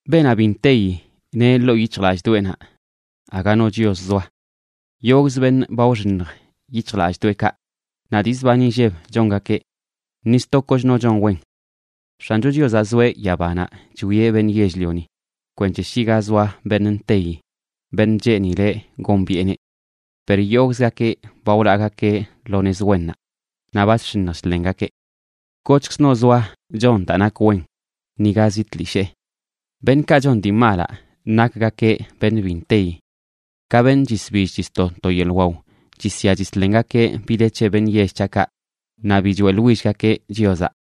Beenaꞌ bi nteyi neꞌ ḻoo yic̱hjlallꞌdoꞌenaꞌ: “Aga no Chios zoa.” Yogꞌzə beṉꞌ ba wxiṉj yic̱hjlallꞌdoꞌekaꞌ, naꞌ dii zban inlleb chongakeꞌ. ¡Ni sto kochno chon wen! X̱ancho Chiozaꞌ zoeꞌ yabanaꞌ chwieꞌ beṉꞌ yell-lioni, kwenc̱he shi ga zoa beṉꞌ nteyi, beṉꞌ cheenileꞌ gombiꞌeneꞌ. Per yogꞌzgakeꞌ ba wlaagakeꞌ lo nez wennaꞌ, naꞌ ba chx̱iṉj chḻengakeꞌ. ¡Kochkzno zoa chon daa nak wen, niga zi tlishee! Beṉꞌkaꞌ chon dii malaꞌ nakgakeꞌ beṉꞌ bi nteyi. Ka beṉꞌ chisbill chisto to yeḻꞌ waw, chisya chislengakeꞌ bi de c̱he beṉꞌ yell c̱haꞌkaꞌ, naꞌ bi choeꞌḻwillgakeꞌ Chiozaꞌ.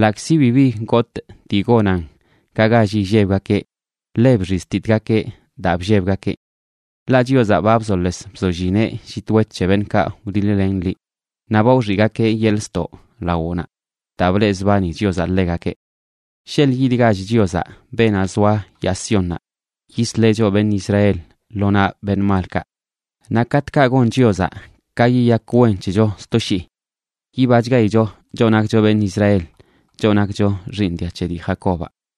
Ḻaꞌkzi bibi gotꞌ dii gonan ka gall illebgakeꞌ, ḻe bxiztitgakeꞌ daa bllebgakeꞌ. Ḻaꞌ Chiozaꞌ ba bzoles bzollineꞌ llit wet c̱he beṉꞌkaꞌ wdiḻ-len liꞌ. Naꞌ ba wxiꞌgakeꞌ yeḻꞌ ztoꞌ lawoꞌnaꞌ, daa bleꞌzbani Chiozaꞌ ḻegakeꞌ. ¡Sheḻꞌ yidgach Chiozaꞌ, beenaꞌ zoa yaa Siónnaꞌ, yisleꞌ choꞌ, beṉꞌ Israel, lo naꞌ beṉꞌ malkaꞌ! Naꞌ katꞌkaꞌ gon Chiozaꞌ ka yiyak wen c̱hecho sto shii yibachgaicho choꞌ nakcho beṉꞌ Israel, choꞌ nakcho xiiṉ dia c̱he dii Jacobaꞌ.